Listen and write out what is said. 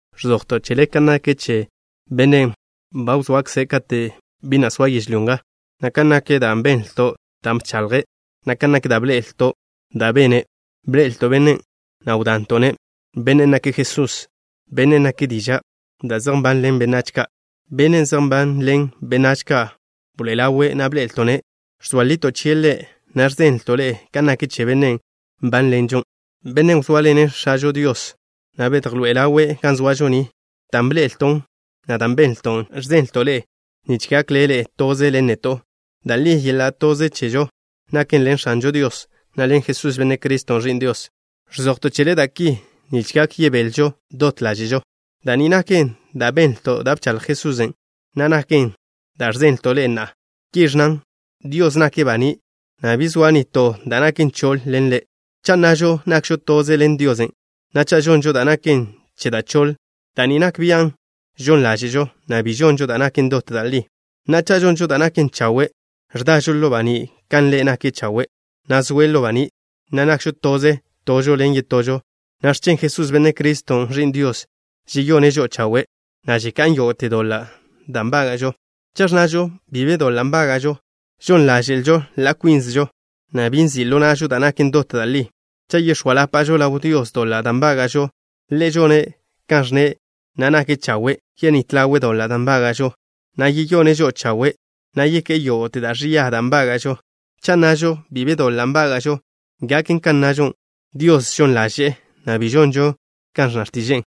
Ẕzojto' chele kan nak che Bennen' ba wzoakze' kate' bi na' soa yežlyó nga, na' kan nak da' benlto' da' bchaḻje', na' kan nak da' bḻe'elto' da' bene'. Bwíato' Bennen', na' wdanto'-ne'. Bennen' nake' Jesús, Bennen' nake' Diža' da' zej nbanḻen benách ka'. Bennen' zej nbanḻen benách ka' bḻoe'e ḻawe', na' bḻe'elto'-ne'. Ẕzoa lito' chie' Ḻe', na' ẕzenlto' ḻe'e kan nak che Bennen' nbánḻenžo. Bennen' wzóaḻene' X̱ažo Dios, na' bedjḻoé'e ḻawe' ga zoažo ni. Dan' bḻe'elton', na' dan' benlton', ẕzenlto' ḻe'e nich gakle ḻe'e toze ḻen neto'. Da' li yeḻa' toze chežo naken ḻen X̱ažo Dios, na' ḻen Jesús, Benne' Criston', Ẕi'n Dios. Ẕzojto' chele da' ki nich gak yebelžo dot ḻáže'žo. Da' ni naken da' benlto' da' bchaḻj Jesusen', na' naken da' ẕzenlto' ḻe'e na'a. Ki ẕnnan: “Dios nake' baní', na' bi zoa nitó da' naken choḻ ḻen Ḻe'.” Cha' nnažo: “Nakžo toze ḻen Diosen'” na' cha' žonžo da' naken che da' choḻ, da' ni nak bian' žon ḻáže'žo, na' bi žonžo da' naken dot da' li. Na'a, cha' žonžo da' naken chawe', ẕdažo ḻo baní' kan Ḻe' nake' chawe', na' zoe' ḻo baní', na' nakžo toze tožo ḻen yetožo, na' x̱chen Jesús, Benne' Criston', Ẕi'n Dios, žeyonen žo'o chawe', na' žeká'n yógo'te doḻa' da' nbága'žo. Cha' ẕnnažo: “Bi be doḻa' nbága'žo” žon ḻáže'lžo ḻa' kwínzežo, na' bi nzi' ḻo na'žo da' naken dot da' li. Cha' yex̱óalapažo ḻaw Dios doḻa' da' nbága'žo, Ḻe' žone' kan ẕnne', na' nake' chawe'. Yenít ḻawe' doḻa' da' nbága'žo, na' yeyone' žo'o chawe', na' yeké'e yógo'te da' ẕia da' nbága'žo. Cha' nnažo: “Bi be doḻa' nbága'žo” gaken kan nnažo: “Dios žon ḻaže'e” na' bi žonžo kan ẕnna x̱tiže'e.